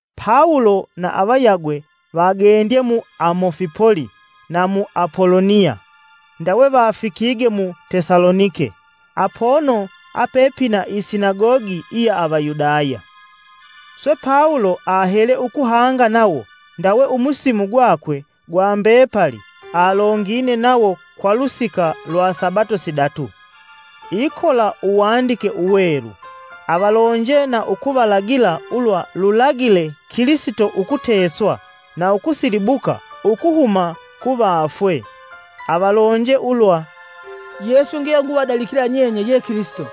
Pawulo na avayagwe vagendye mu Amufipoli na mu Apoloniya, ndawe vafikige mu Tesalonike, apono apepina isinagogi iya Avayudaya. Swe Pawulo ahele ukuhanga nawo ndawe umusimu gwakwe gwa mbepali alongine nawo kwa lusika lwa sabato sidatu, ikola uwandike uwelu. Avalonje na ukuvalagila ulwa lulagile Kilisito ukuteswa na ukusilibuka ukuhuma kuvafwe. Avalonje ulwa, “Yesu yenguvadalikila nyenye ye Kilisito.”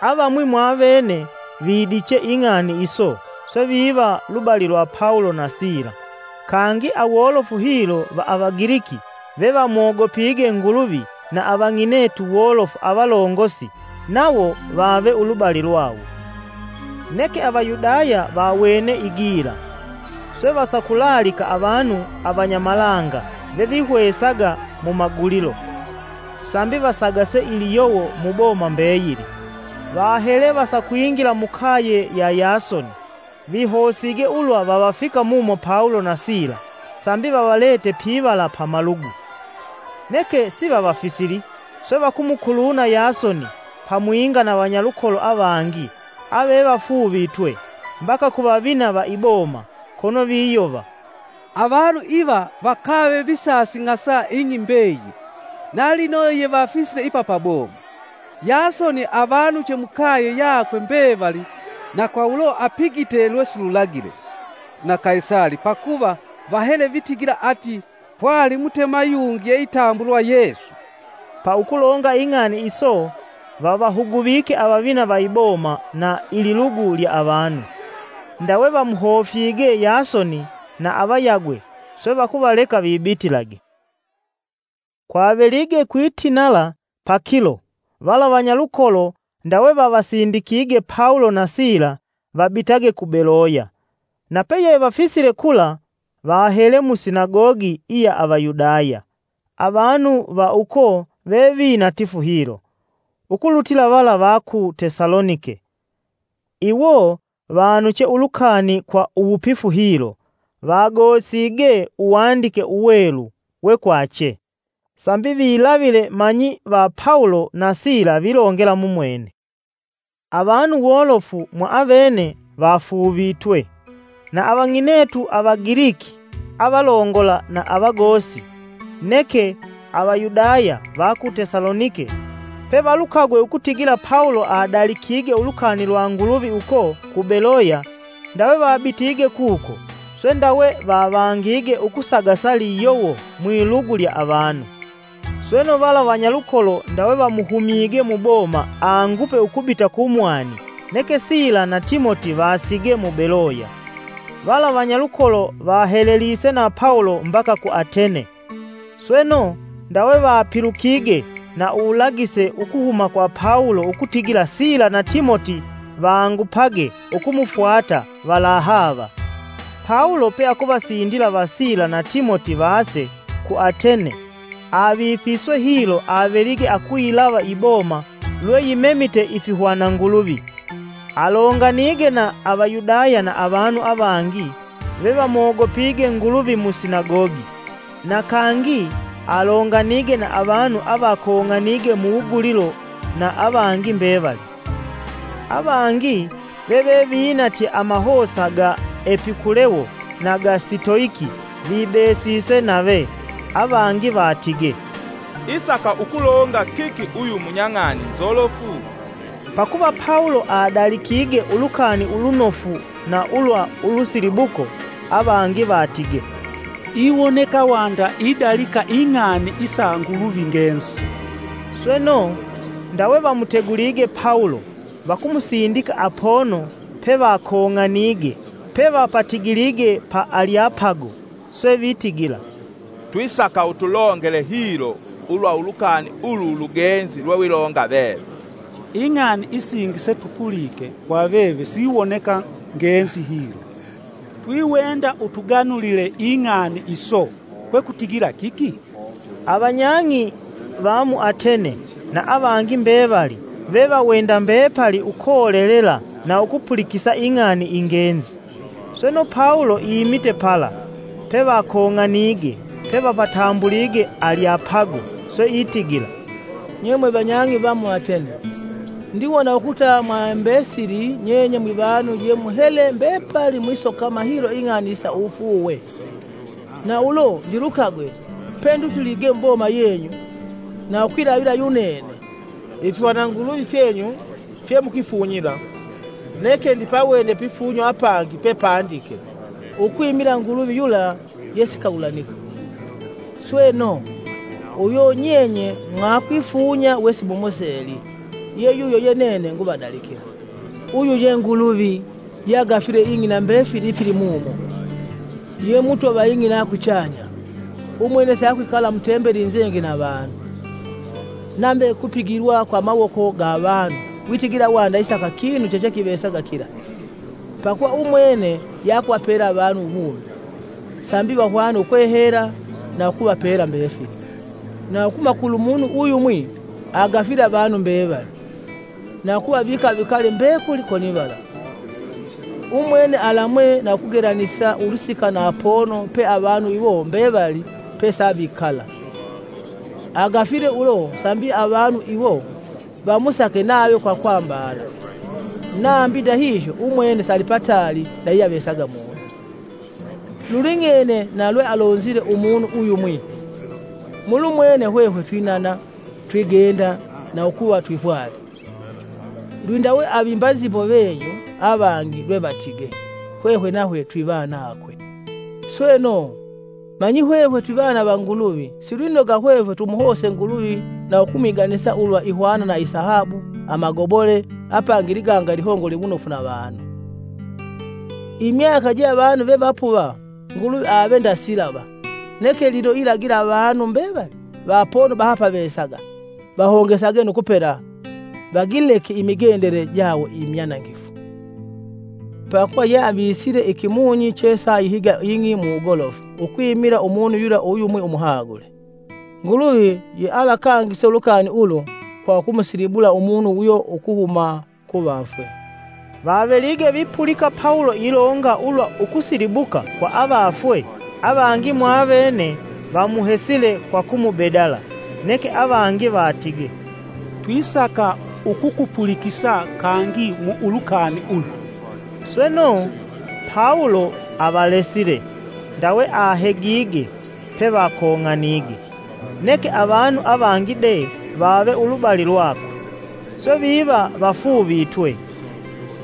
Avamwi mwavene vidiche ing'ani iso swe viva lubali lwa Pawulo na Sila. Kangi, awolofu hilo va Avagiliki vevamogopige Nguluvi na avang'inetu wolofu avalongosi nawo vave ulubali lwawo. Neke Avayudaya vawene igila; swe vasakulaalika avanu avanyamalanga vavihwesaga mu mumagulilo, sambi vasagase liyowo muboma mbeyili. Vahele vasakwingila mukaye ya Yasoni vihosige ulwa vavafika mumo Pawulo na Sila sambi vavalete pivala pa malugu. Neke sivavafisili swe vakumukuluna Yasoni pamwinga na vanyalukolo avangi (avevafuuvitwe) mbaka ku vavina va iboma, kono viyova: “Avanu iva vakave visasing'asa ing'i mbeyili na lino yevafisile ipa pa boma. Yasoni avanuche mukaye yakwe mbevali na kwa ulo apigite lwesilulagila na Kaisali pakuva vahele vitigila ati, ‘Pwali Mutema yungi yeitambulwa Yesu.’” Pa ukulonga ing'ani iso vavahuguvike avavina va iboma na ililugu lya avanu. Ndawe vamuhofyige Yasoni na avayagwe swe vakuvaleka vibitilage. Kwavelige kwitinala pakilo, vala vanyalukolo ndawe vavasindikige Pawulo na Sila vabitage ku Beloya. Napeyevafisile kula, vahele mu sinagogi iya Avayudaya. Avanu va uko vevinatifu hilo ukulutila vala va ku Tesalonike. Iwo vanuche ulukani kwa uwupifu hilo, vagosige Uwandike Uwelu we kwache, sambi vilavile manyi va Pawulo na Sila vilongela mumwene. Avanu wolofu mwaavene vafuuvitwe; na avang'inetu Avagiliki avalongola na avagosi. Neke, Avayudaya va ku Tesalonike pevalukagwe ukutigila Pawulo adalikige ulukani lwa Nguluvi uko ku Beloya, ndawe vabitige kuko, swe ndawe vavangige ukusagasa liyowo mwilugu lya avanu. Sweno, vala vanyalukolo ndawe vamuhumyige muboma angupe ukubita kumwani neke Sila na Timoti vasige mu Beloya. Vala vanyalukolo vahelelise na Pawulo mbaka ku Atene. Sweno, ndawe vapilukige na uwulagise ukuhuma kwa Pawulo ukutigila Sila na Timoti vangupage ukumufwata valahaava. Pawulo peakuvasindila va Sila na Timoti vase ku Atene, avifiswe hilo avelige akuyilava iboma lwe yimemite ifihwana nguluvi. Alonganige na Avayudaya na avanu avangi vevamogopige Nguluvi mu Sinagogi; na kangi alonganige na avanu avakong'anige muwugulilo na avangi mbevali. Avangi vevevinatye amahosa ga Epikulewo na ga Sitoiki vibesise nave. Avangi vatige, “Isaki ukulonga kiki uyu munyang'ani nzolofu?” Pakuva Pawulo adalikige Ulukani Ulunofu na ulwa ulusilibuko; avangi vatige, “Iwoneka wanda idalika ing'ani isa nguluvi ngenzi.” Sweno, ndawe vamutegulige Pawulo, vakumusindika apono pevakong'anige pevapatigilige pa Alyapago swe vitigila, “Twisaka utulongele hilo ulwa ulukani ulu ulugenzi lwewilonga veve. Ing'ani isingi setupulike kwa veve siwoneka ngenzi hilo. Twiwenda utuganulile ing'ani iso kwekutigila kiki?” Avanyag'i va mu Atene na avangi mbevali vevawenda mbepali ukolelela na ukupulikisa ing'ani ingenzi. Sweno, Pawulo imite pala pevakong'anige pevapatambulige Alyapago, swe itigila, “Nye mwevanyang'i va mu Atene! Ndiwona ukuta mwaimbesili nyenye mwivanu ye muhele mbepali mwisokama hilo ing'ani isa uwufuuwe. Na ulo ndilukagwe pendutilige muboma yeyu na ukwilavila yunene ifihwana nguluvi fyenyu fye mukwifunyila neke ndipawene pifunyo apangi pepandike: ‘Ukwimila Nguluvi yula yesikagulanika.’ Sweno, uyo nyenye mwakwifunya wesimumuseli ye yuyo ye nene nguvadalikila. Uyu ye Nguluvi, yeagafile ing'i na mbefili ifilimumo, ye Mutwa va ing'i na kuchanya; Umwene siakwikala mutembeli inzenge na avanu. Nave kupigilwa kwa amawoko ga avanu witigila wanda isaka kinu chechekivesaga kila, pakuva umwene yeakuvapela avanu uwumi, sambi vahwane ukwehela na ukuvapela mbefili. Na ukuhuma kulumunu uyumwi agafile avanu mbevali, na ukuvavika vikale mbekuli konivala. Umwene alamwe na ukugelanisa ulusika na apono pe avanu iwo mbevali pesavikala. Agafile ulo sambi avanu iwo vamusake nave kwa kwambala, nambi ndahihyo. Umwene salipataali na yeyeavesaga munu. Luling'ene na lwealonzile umunu uyumwi: ‘Mulumwene hwehwe twinana, twigenda, na ukuva twipwali!’ Lwindawe avimba nzimbo venyu avangi lwevatige: ‘Hwehwe nahwe twivanakwe.’ Sweno, manyi hwehwe twivana va Nguluvi silwinoga hwehwe tumuhose Nguluvi na ukumwiganisa ulwa ihwana na isahabu, amagobole apangi iliganga ilihongole wunofu na avanu. Imyaka je avanu vevapuva Nguluvi ave nda silava. Neke lino ilagila avanu mbevali, va apono bahapavesaga vahongesage nu kupela vagileke imigendele jawo imyanangifu. Pakuva yeavisile ikimunyi chesa ayihiga ing'i kwa uwugolofu ukwimila umunu yula uyumwi umuhagule. Nguluvi yealakangise ulukani ulu kwa ukumusilibula Umunu uyo ukuhuma kuvafwe.” Vavelige vipulika Pawulo ilonga ulwa ukusilibuka kwa avafwe, avangi mwaavene vamuhesile kwa kumubedala; neke avangi vatige, “Twisaka ukukupulikisa kangi ulwa ulukani ulu!” Sweno, Pawulo avalesile, ndawe ahegige pevakong'anige. Neke avanu avangi de vave ulubali lwakwe, swe viva vafuuvitwe.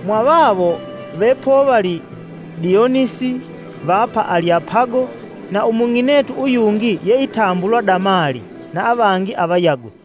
Mwavawo vepovali Dionisi va pa Alyapago, na umung'inetu uyungi yeitambulwa Damali na avangi avayagwe.